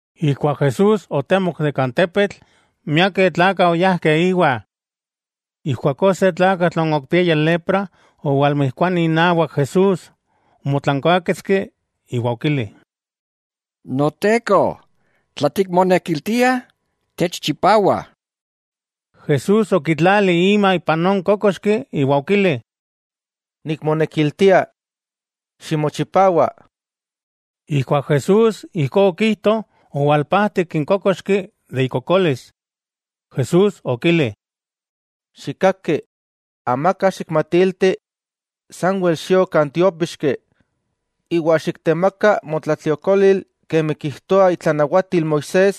Ijkuak Jesús otemok de kan tepetl, miakeh tlakah oyajkeh íwa. Ijkuakó se tlakatl non okipiaya lepra owalmijkuani inawak Jesús, omotlankuaketski iwa okili: —Noteko, tla tikmonekiltia, techchipawa. Jesús okitlali ima ipan non kókoxki iwa okili: —Nikmonekiltia. ¡Ximochipawa! Ijkuak Jesús ijkó okijto, owalpajtik n kókoxki de ikokolis. Jesús okili: —Xikkaki, amaka xikmatilti, sanwel xio kan tiópixki, iwa xiktemaka motlatliokolil kemi kijtoa itlanawatil Moisés,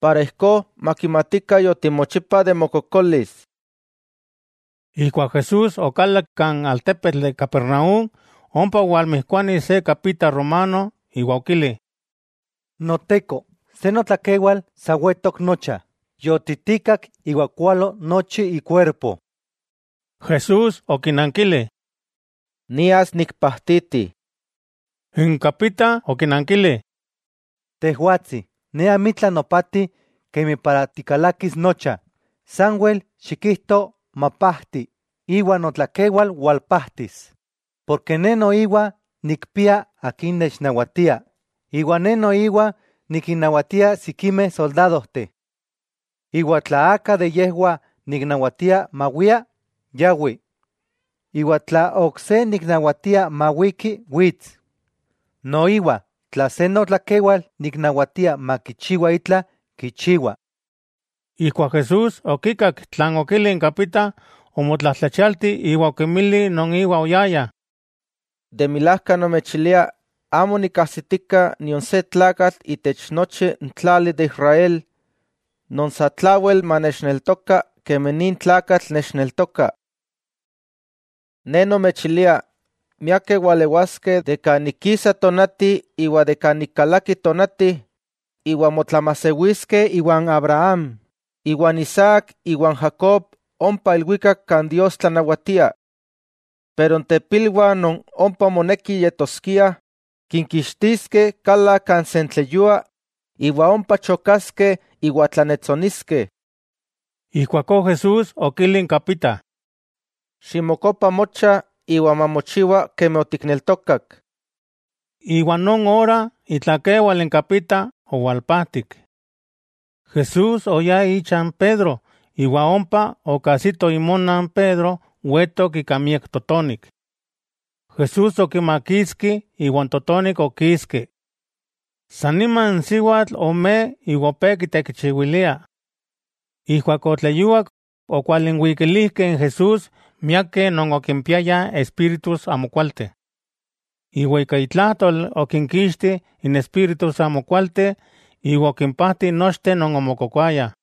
para ijkó makimatikah yotimochipa de mokokolis. Ijkuak Jesús okalak kan altepetl de Capernaúm, ompa owalmijkuani se kapita romano, iwa okili: —Noteko, se notlakewal sa wetok nocha, yotitikak iwa kualo nochi ikuerpo. Jesús okinankili: —Nias nikpajtiti. N kapita okinankili: —Tejwatsi, ne amitla nopati kemi para tikalakis nocha. Sanwel xikijto, “mapajti,” iwa notlakewal walpajtis. Porke ne noiwa nikpia akin nechnawatia, iwa ne noiwa nikinnawatia sikimeh soldadojteh. Iwa tla aka niknawatia mawia, yawi. Iwa tla ok se niknawatia mawiki, wits. Noiwa tla se notlakewal niknawatia makichiwa itla, kichiwa. Ijkuak Jesús okikak tlan okili n kapita, omotlajtlachialti iwa okinmili non íwa oyayah: —De milajka nomechilia, amo nikkajsitika nion se tlakatl itech nochi n tlali de Israel, non satlawel manechneltoka kemi nin tlakatl nechneltoka. Ne nomechilia miakeh walewaskeh de kan ik kisa tonati iwa de kan ik kalaki tonati, iwa motlamajsewiskeh iwan Abraham, Isaac iwa Jacob ompa ilwikak kan Dios tlanawatia. Pero n tepilwah non ompa moneki yetoskiah, kinkixtiskeh kala kan sentleyua, iwa ompa chokaskeh iwa tlannetsoniskeh. Ijkuakó Jesús okili n kapita: —Ximokopa mocha, iwa mamochiwa kemi otikneltokak. Iwa non ora itlakewal n kapita owalpajtik. Jesús oyá icha n Pedro, iwa ompa okajsito imona n Pedro wetok ika miak totonik. Jesús okimakitski, iwa n totonik okiski. San nima n siwatl omej iwa opé kitekichiwilia. Ijkuak otleyuak, okwalinwikilijkeh n Jesús miakeh non okimpiayah espíritus amokualteh. Iwa ika itlajtol okinkixti n espíritus amokualteh iwa okimpajti nochteh non omokokoayah.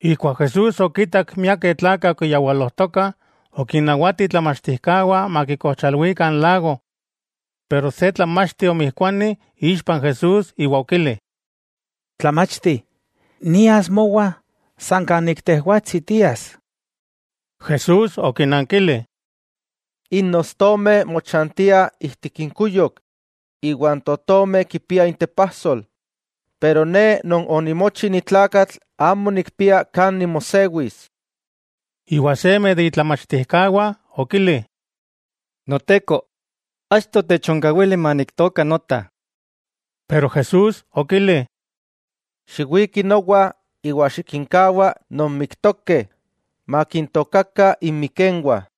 Ijkuak Jesús okitak miakeh tlakah okiyawalojtokah, okinnawati itlamachtijkawah makikojchalwikah n lago. Pero se tlamachti omijkuani ixpa Jesús iwa okili: —Tlamachti, nias mowa san kan ik tejwatsi tias. Jesús okinankili: —N ostomeh mochantiah ijtik inkuyok, iwa n totomeh kipiah intepajsol, pero Ne Non onimochi ni tlakatl amo nikpia kan nimosewis. Iwa seme de itlamachtijkawah okili: —Noteko, achto techonkawili maniktooka nota. Pero Jesús okili: —Xiwiki nowa, iwa xikinkawa non miktokeh makintookakah inmikenwah.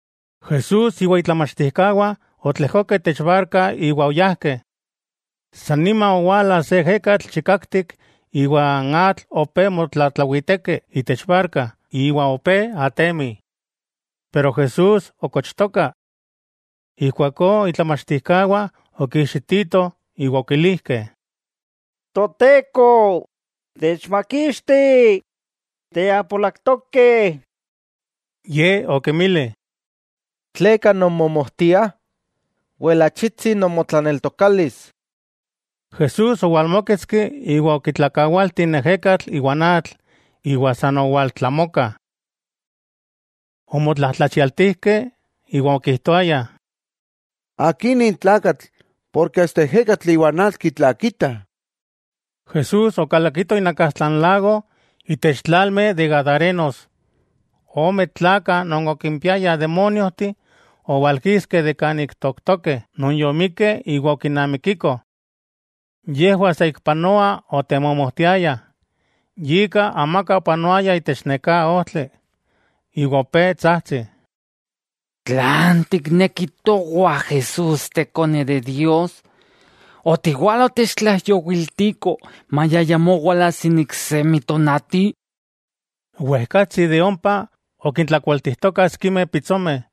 Jesús iwa itlamachtijkawah otlejkokeh itech barka iwa oyajkeh. San nima owala se ejekatl chikaktik iwa n atl opé motlatlawiteki itech barka iwa opé atemi. Pero Jesús okochtoka. Ijkuakó itlamachtijkawah okiijxititoh, iwa okilijkeh: —¡Toteko, techmakixti! ¡Tiapolak tokeh! Ye okinmili: —¿Tleka nonmomojtiah? ¡Wel achitsi nomotlaneltokalis! Jesús owalmóketski iwa okitlakawalti n ejekatl iwa n atl, iwa san owaltlamoka. Omotlajtlachialtijkeh iwa okijtoayah: —¡Akí nin tlakatl, porke asta n ejekatl iwa n atl kitlakitah! Jesús okalakito inakastla n lago, itech tlalmeh de gadarenos. Ome tlakah non okimpiayah demóniojteh owalkiskeh kan ik tooktokeh non yomikeh iwa okinamikikoh. Yejwah saikpanoa otemomojtiayah, yika amaka opanoaya itech neká ojtli. Iwa opé tsajtsih: —¿Tlan tikneki towah Jesús Tekone de Dios? ¿Otiwala otechtlaijyowiltiko maya ayamó walajsi n iksemi tonati? Ik ompa okintlakualtijtokah sikimeh pitsomeh.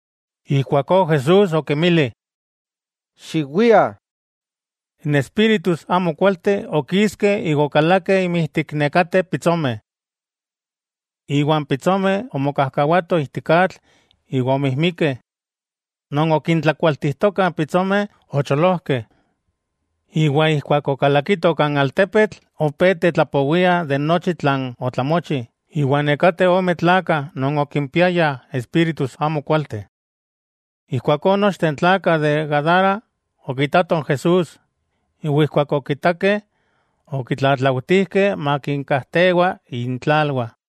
Ijkuakó Jesús okinmili: —Xiwiah. N espíritus amokualteh okiskeh iwa okalakeh inmijtik nekateh pitsomeh. Iwa n pitsomeh omokajkawatoh ijtik atl iwa omijmikeh. Non okintlakualtijtokah n pitsomeh ocholojkeh, iwa ijkuak okalakitoh kan altepetl opé tetlapowiah de nochi tlan otlamochi, iwa nekateh ome tlakah non okimpiayah espíritus amo kualteh. Ijkuakó nochteh n tlakah de Gadara okitatoh n Jesús, iwa ijkuak okitakeh, okitlatlautijkeh makinkajtewa intlalwah.